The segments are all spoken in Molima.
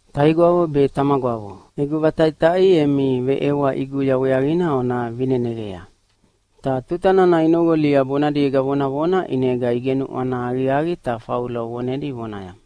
“Taigwavo be tamagwavo, egu vataʼitaʼi emi veʼewa ʼiguya weaqina ona vineneqa.” Ta tuta nana inoqolia bonadiega vonavona ʼinega igenuʼwana aqiaqi ta Faulo vonedi vonaya,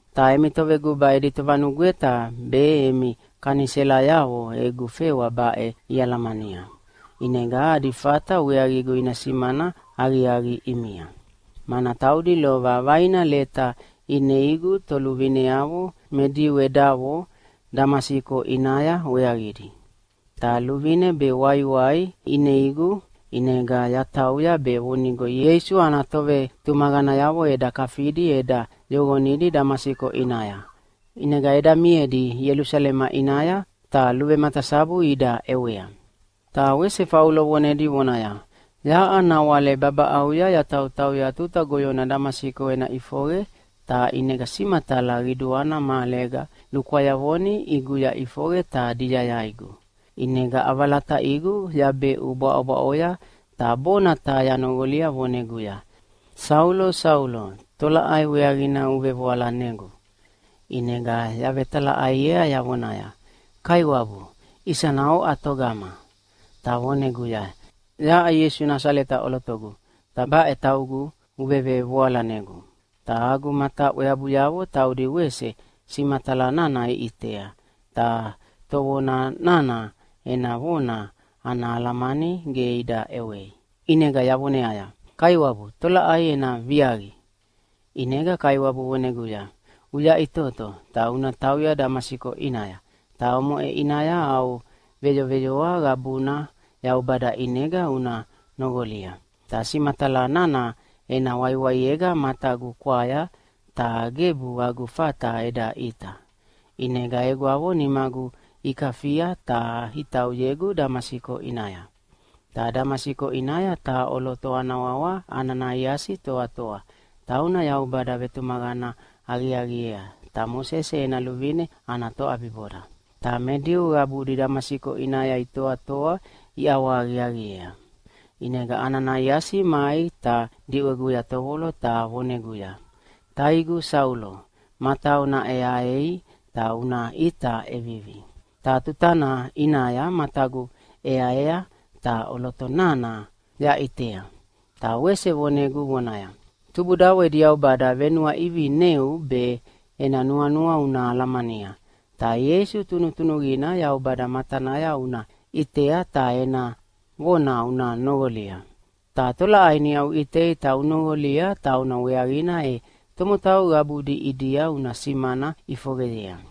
Ta emi toveguba edi tovanugweta be emi kaniselayavo egu fewa baʼe ialamania, ʼinega adi fata weaqigu ina simana aqiaqi ʼimia. Mana taudi lova vaina leta ineigu toluvineavo me Diu edavo Damasiko ʼinaya weaqidi. Ta luvine be waiwai ineigu ʼinega yatauya be vonigo Ieisu ana tovetumaqanayavo eda kafidi eda yoqonidi Damasiko ʼinaya, ʼinega eda miedi Ielusalema ʼinaya ta luvematasabu ida ʼewea.” Ta wese Faulo vonedi vonaya, “Yaʼa nawale babaʼauya yatautauya tuta goyona Damasiko ena ʼifoqe, ta ʼinega simatala qiduana mahalega lukwayavoni ʼiguya ʼifoqe ta diyayaigu. ʼInega ʼavalataʼigu yabeʼu bwaʼobwaʼoya ta bona taha yanoqolia voneguya, ‘Saulo, Saulo, tolaʼai weaqina uvevoalanegu?’ “ʼInega yavetalaʼaiea yavonaya, ‘Kaiwabu, isana oʼa togama?’ “Ta voneguya, ‘Yaʼa Ieisu Nasaleta ʼolotogu, ta baʼe taugu uvevevoalanegu.’ Ta agu mataʼweabuyavo taudi wese simatala nana iʼitea, ta tovona nana ena vona ana alamani ge ida ʼewei. ʼInega yavoneaya, ‘Kaiwabu, tolaʼai ena viaqi?’ “ʼInega Kaiwabu voneguya, ‘Uyaʼitoto, ta una tauya Damasiko ʼinaya, ta omoʼe ʼinaya au veyoveyoa qabuna Yaubada ʼinega una noqolia.’ Ta simatala nana ena waiwaiega matagu kwaya, ta gebu agu fata eda ʼita. ʼInega egwavo nimagu ikafia ta itauyegu Damasiko ʼinaya. “Ta Damasiko ʼinaya taha ʼoloto ana wawa Ananaiasi toatoa, tauna Yaubada vetumaqana aqiaqiea, ta Mosese ena luvine ana toʼabiboda. Ta me Diu qabudi Damasiko ʼinaya itoatoa iʼawahaqiaqiea. ʼInega Ananaiasi mai ta diʼweguya tovolo ta voneguya, ‘Taigu Saulo, matau naʼeaei ta una ʼita ʼevivi.’ Ta tutana ʼinaya matagu ʼeaea ta ʼoloto nana yaʼitea. Ta wese vonegu vonaya, ‘Tubudavo edi Yaubada venuaʼivineu be ena nuanua una alamania, ta Ieisu Tunutunuqina Yaubada matanaya una ʼitea ta ena vona una noqolia. Ta tolaʼai niʼa uʼitei ta unoqolia tauna weaqina e tomotau qabudi ʼidia una simana ʼifoqeyea.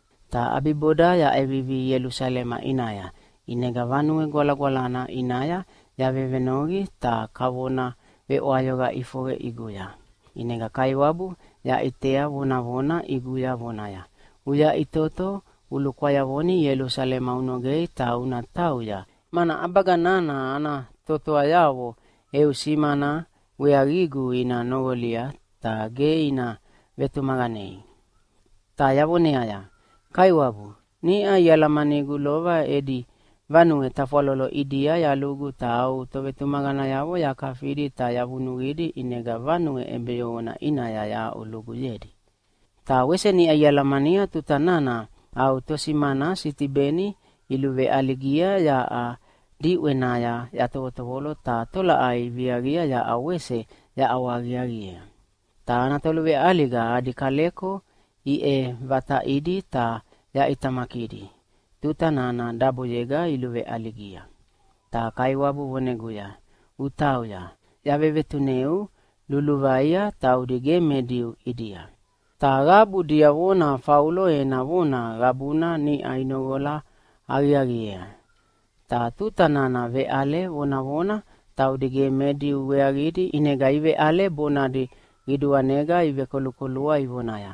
“Ta ʼabiboda yaʼevivi Ielusalema ʼinaya. ʼInega Vanue Gwalagwalana ʼinaya yavevenoqi ta kavona veʼwayoqa ʼifoqe ʼiguya. ʼInega Kaiwabu yaʼitea vonavona ʼiguya vonaya, ‘Uyaʼitoto ulukwayavoni Ielusalema unogei ta una tauya, mana ʼabaga nana ana totoayavo eu simana weaqigu ina noqolia, ta ge ina vetumaqanei.’ “Ta yavoneaya, ‘Kaiwabu, niʼa ialamanigu lova edi vanue tafwalolo ʼidia yalugu ta au tovetumaqanayavo yakafidi ta yavunuqidi ʼinega vanue ʼebeyoqona ʼinaya yahaʼuluguyedi. Ta wese niʼa ialamania tuta nana au tosimana Sitibeni iluveʼaligia yaʼa diʼwenaya yatovolo ta tolaʼai iviaqia yaʼa wese yaʼawahaqiaqiea. Ta ana toluveʼaliga adi kaleko iʼevataʼidi ta yaʼitamakidi tuta nana daboyega iluveʼaligia.’ “Ta Kaiwabu voneguya, ‘Utauya, yavevetuneu luluvaia taudi ge me Diu ʼidia.’” Ta qabu diavona Faulo ena vona qabuna niʼa inoqola aqiaqiea. Ta tuta nana veʼale vonavona taudi ge me Diu weaqidi ʼinega iveʼale bonadi qiduanega ivekolukolua ivonaya,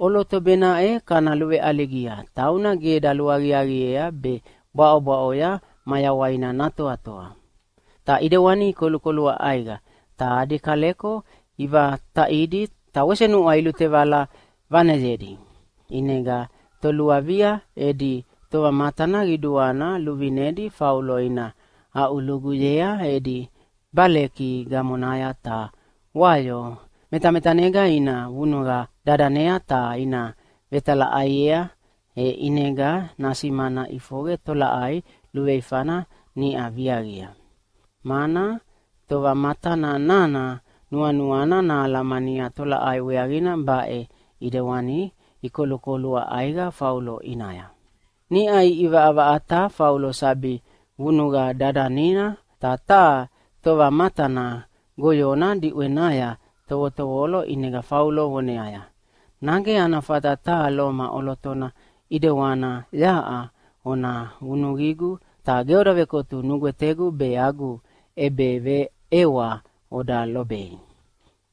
“ʼOloto baʼena kana luveʼaligia, tauna ge daluaqiaqiea be bwaʼobwaʼoya mayawaina natoa!” Ta ʼidewani ikolukolua ʼaiqa, ta adi kaleko ivataʼidi ta wese nuʼwa ilutevala vaneyedi. ʼInega toluavia edi tovamatana qiduana luvinedi Faulo ina aʼuluguyea edi baleki gamonaya ta wayo metametanega ina vunuqa dadanea ta ina vetalaʼaiea, e ʼinega nasimana ʼifoqe tolaʼai luveifana niʼa viaqia. Mana tovamatana nana nuanuana nahalamania tolaʼai weaqina baʼe ʼidewani ikolukolua ʼaiqa Faulo ʼinaya. Niʼa iʼivaʼavaʼata Faulo sabi vunuqa dadanina, ta taha tovamatana goyona diʼwenaya tovotovolo ʼinega Faulo voneaya, “Nage ana fata taha Loma ʼolotona ʼidewana yaʼa ona vunuqigu ta ge oda vekotu nugwetegu be agu ʼebeveʼewa oda lobei?”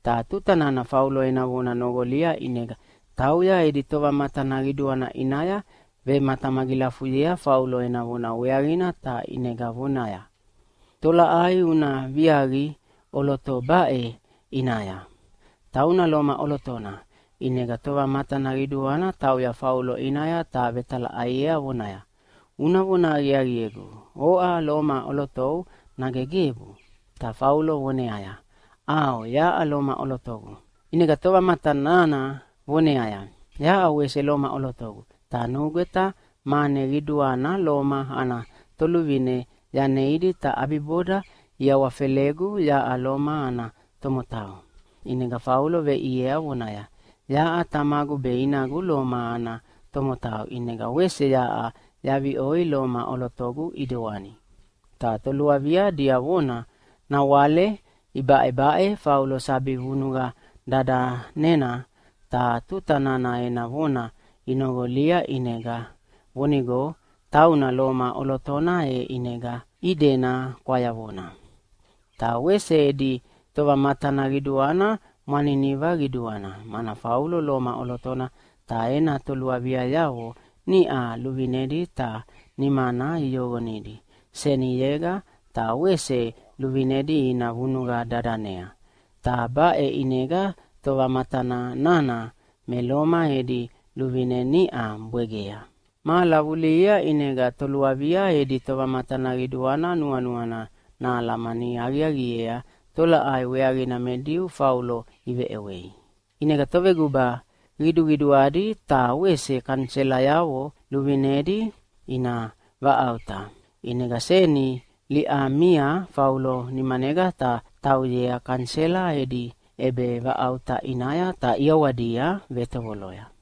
Ta tuta nana Faulo ena vona noqolia ʼinega tauya edi tovamatana qiduana ʼinaya vematamagilafuyea Faulo ena vona weaqina ta ʼinega vonaya, “Tolaʼai una viaqi ʼoloto baʼe ʼinaya? Tauna Loma ʼolotona.” ʼInega tovamatana qiduana tauya Faulo ʼinaya ta vetalaʼaiea vonaya, “Una vona aqiaqiegu, oʼa Loma ʼolotou, nage gebu?” Ta Faulo voneaya, “ʼAo, yaʼa Loma ʼolotogu.” ʼInega tovamatana nana voneaya, “Yaʼa wese Loma ʼolotogu, ta nugweta mane qiduana Loma ana toluvine yaneidi ta ʼabiboda iawafelegu yaʼa Loma ana tomotau.” ʼInega Faulo veʼiea vonaya, “Yaʼa tamagu be inagu Loma ana tomotau, ʼinega wese yaʼa yaviʼoi Loma ʼolotogu ʼidewani.” Ta toluavia diavona nawale ibaʼebaʼe Faulo sabi vunuqa dadanena, ta tuta nana ena vona inoqolia vonigo tauna Loma ʼolotona e ʼinega idena kwayavona. Ta wese edi tovamatana qiduana mwaniniva qiduana, mana Faulo Loma ʼolotona ta ena toluaviayavo niʼa luvinedi ta nimana iyoqonidi seniyega ta wese luvinedi ina vunuqa dadanea, ta baʼe ʼinega tovamatana nana me Loma edi luvine niʼa bwegea. Mahala vulihia ʼinega toluavia edi tovamatana qiduana nuanuana nahalamani aqiaqiea tolaʼai weaqina me Diu Faulo iveʼewei. ʼInega toveguba qiduqiduadi ta wese kaniselayavo luvinedi ina vaʼauta. ʼInega seni liʼamia Faulo nimanega ta tauyea kanisela edi ʼebevaʼauta ʼinaya ta ʼiawadia vetovoloya.